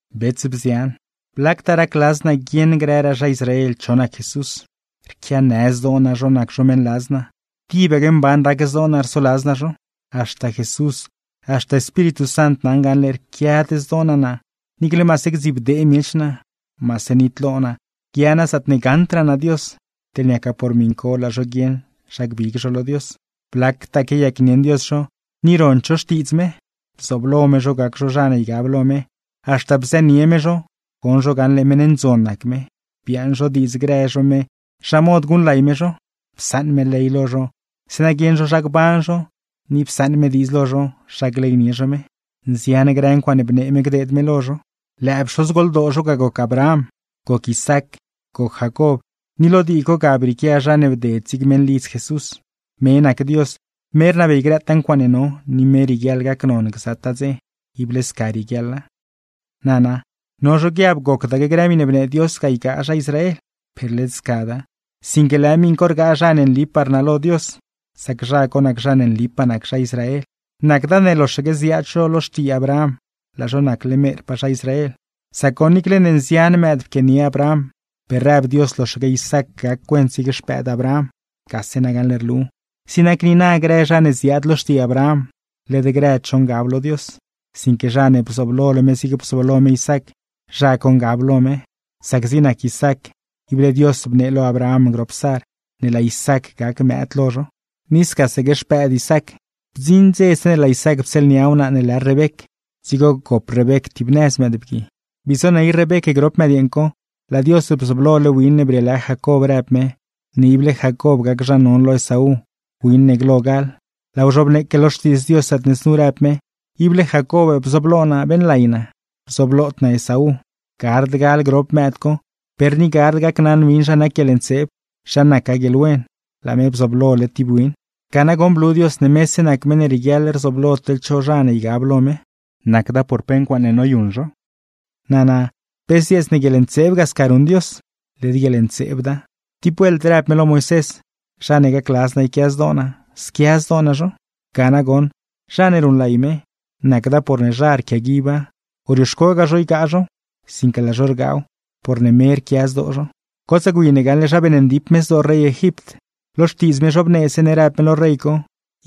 Bets, bzian, ¡blactaa racladz naa guieṉ grëraa zha Israel cho nac Jesús! Rquianë zdoo naa zho nac zho meṉladz naa, tibaque mban rac zdoo naa rsoladz naa zho. Haxta Jesús, haxta Espíritu Sant naṉ gaṉle rquiad zdoo naa naa niicle maase gdzibdee miech naa, maase nitlo naa guia naa zaatne gaṉdraa naa Dios, teḻne niaca por miṉ co laa zho guieṉ zha gbig zho lo Dios. Blactaa quiayacnieṉ Dios zho, ni rond zho xtiidz me. Bzooblo me zho gac zho zha ne ygab lo me, haxta bzënie me zho, goṉ zho gaṉle meṉ ndzon nac me; biaaṉ zho diidz grë zho me zha mod guṉlay me zho. Psaṉ me ley lo zho zeeṉa guieṉ zho zha gban zho, ni psaṉ me diidz lo zho zha gleynie zho me. Nzian grë ncuaaṉe bnee me gdeed me lo zho. Lëë pxozgoldoo zho ga goc Abraham, goc Isaac, goc Jacob, ni lo dii co ga brieequia zha ne bded zig meṉlidz Jesús. Me nac Dios, me rnabey grëtaa ncuaaṉe no, ni me rieguiaḻ gacnon gzataa dze. Ible sca rieguiaḻa. Nana, no zho guiab gocdaque grë miṉe bnee Dios ga ygaa zha Israel. Per led scada. Sinque lëë miṉ co rgaa zha ne nlipaa rnalo Dios, sac zha co nac zha ne nlipaa nac zha Israel. Nacda ne loxaque ziaad zho lo xtii Abraham, laa zho nacle merpaa zha Israel; sac goṉ, niicle ne nzian mëëd pquianie Abraham, per rëb Dios loxaque Isaac gac cuent zig xpëëd Abraham. Gase nagaṉle rlu, zig nac niina, grë zha ne ziaad lo xtii Abraham, led grëd zho ngab lo Dios; sinque zha ne bzooblole me zigne bzooblo me Isaac, zha co ngab lo me. Sac zig nac Isaac, ible Dios bnee lo Abraham grop Sar, ne laa Isaac gac mëëd lo zho. Ni scasaque xpëëd Isaac. Bdziṉ dze, zeeṉe laa Isaac ptsieelnia wnaa ne lë Rebec, dzigo gop Rebec tibnëz mëëdbgui. Bii zoney Rebec grop mëdyeeṉ co, laa Dios bzooblole win ne brieelë Jacob rëb me, ne ible Jacob gac zha non lo Esaú, win ne glo gal. Laaw zhobneeque lo Xtiidz Dios, zaatne znu rëb me: “Ible Jacob bzooblo naa beeṉlay naa, bzoblod naa Esaú.” Gard gal grop mëëd co, per ni gard gacnaṉ win zha nac guieḻntseeb, zha nacgaa guieḻwen, laa me bzooblole tib win. Ga nagoṉ, blu Dios ne mese nac meṉ ne rieguiaḻ rzooblo teḻ cho zha ne ygab lo me, nacda por pe ncuaaṉe noyuṉ zho. Nana, ¿pe zdzieets ne guieḻntseeb ga sca ruṉ Dios? ¡Led guieḻntseebda! Tib vuelt rëb me lo Moisés: “Zha ne gacladz naa yquia zdoo naa, squia zdoo naa zho.” Ga nagoṉ, zha ne ruṉlay me, nacda porne zha rquiaguiba, o rioxcogaa zho ygaa zhow; sinque laa zho rgaaw, porne me rquia zdoo zho. Gotsaa gwi ne gaṉle zha beeṉndip me zdoo rey Egipt. Lo Xtiidz me zhobnee zeeṉe rëb me lo rey co: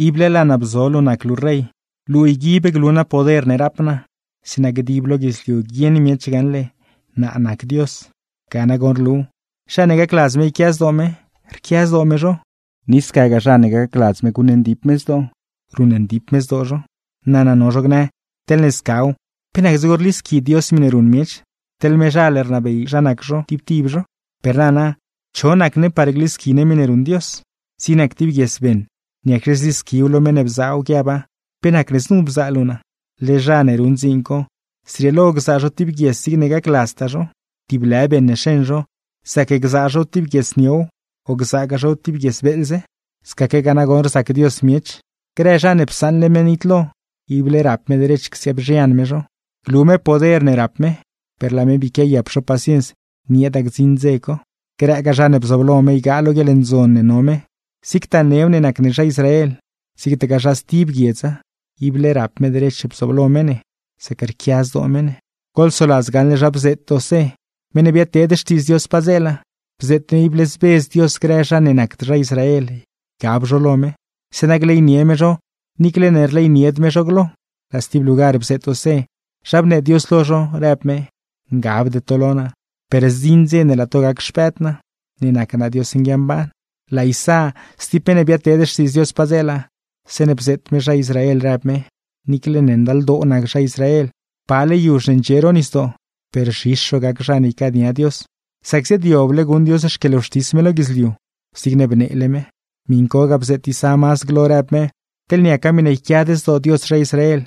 “Ible laa naa bzo luu nac luu rey, luu yguib glu naa poder ne rap naa, zeeṉa dib lo guidzliu guieṉ miech gaṉle naa nac Dios.” Ga nagoṉ rlu, zha ne gacladz me yquia zdoo me, rquia zdoo me zho; ni scagaa, zha ne gacladz me guṉndip me zdoo, ruṉndip me zdoo zho. Nana, no zho gnë: “Teḻne scaw, ¿pe nac dzigo rlisqui Dios miṉe ruṉ miech, teḻ mezhal rnabey zha nac zho tib tib zho?” Per nana, ¿cho nac ne par glisqui ne miṉe ruṉ Dios? Zig nac tib guies beṉ, niacxe zlisquiw lo meṉ ne bzaaw, guiaba: “¿Pe nacne znu bzaa luu naa?” Led zha ne ruṉ dziin co, zrieelo gzaa zho tib guies zigne gacladztaa zho; tib lë beṉ ne xeṉ zho, zac gzaa zhow tib guies niow, o gzaagaa zhow tib guies beeḻze. Scaquegaa nagoṉ rzac Dios miech. Grë zha ne psaṉle me nitlo, ible rap me derech csiaabzhian me zho, glu me poder ne rap me; per laa me bii quiayap zho paciens nieeda gdziṉ dze co. Grëgaa zha ne bzooblo me ygaa lo guieḻndzon ne no me, zigtaa new ne nac ne zha Israel, zigtagaa zha stib guiedza; ible rap me derech bzooblo me ne, sac rquia zdoo me ne. Goḻsoladz gaṉle zha bzeet Osé, meṉ ne biadteed xtiidz Dios padzeela. Bzeet me ible zbedz Dios grë zha ne nacd zha Israel ygab zho lo me, zeeṉa gleynie me zho niicle ne rleynied me zho glo. Laa stib lugar bzeet Osé, zha bnee Dios lo zho, rëb me: “Ngabde to lo naa, per zdziṉ dze ne laa to gac xpëëd naa, ne nac naa Dios nguiamban.” Laa Isá stib meṉ ne biadteed xtiidz Dios padzeela, zeeṉe bzeet me zha Israel rëb me: “Niicle ne ndaldoo nac zha Israel pale yuzh ne ndxie ro nisdoo, per zhis zho gac zha ne ycaania Dios; sac ziaadyoble guṉ Dios xquieḻwxtis me lo guidzliu, zigne bneele me.” Miṉ co ga bzeet Isá mazd glo, rëb me: “Teḻne niaca miṉe yquiad zdoo Dios zha Israel,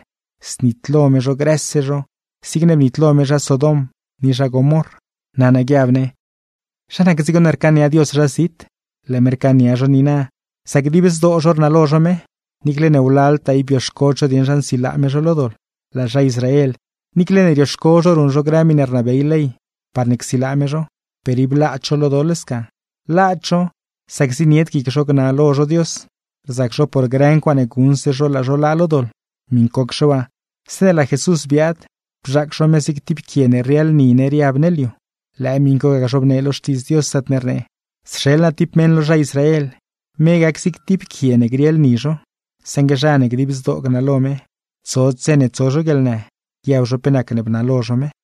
znitlo me zho grëse zho zigne bnitlo me zha Sodom ni zha Gomorr.” Nana guiab ne: ¿Zha nac dzigo ne rcaania Dios zha zit? Laa me rcaania zho niina sac dib zdoo zho rnalo zho me, niicle ne wlaltaa ib bioxcod zho dieṉ zha nsilaa me zho lo doḻ. Laa zha Israel, niicle ne rioxco zho ruṉ zho grë miṉe rnabey ley parne csilaa me zho, per ib laad zho lo doḻ sca. Laad zho, sac zienied guic zho gnalo zho Dios, rzac zho por grë ncuaaṉe guṉse zho laa zho laa lo doḻ. Miṉcocxe waa, zeeṉe laa Jesús biaad, bzhaac zho me zig tib quie ne rrieḻ ni ne riab ne liu. Lëë miṉ co ga zhobnee lo Xtiidz Dios, zaatne rnee: Sxeḻ naa tib meṉ lo zha Israel, me gac zig tib quie ne grieḻ ni zho; saṉgue zha ne dib zdoo gnalo me, tsod dze ne tso zho guieḻnë, guiab zho pe nacne bnalo zho me.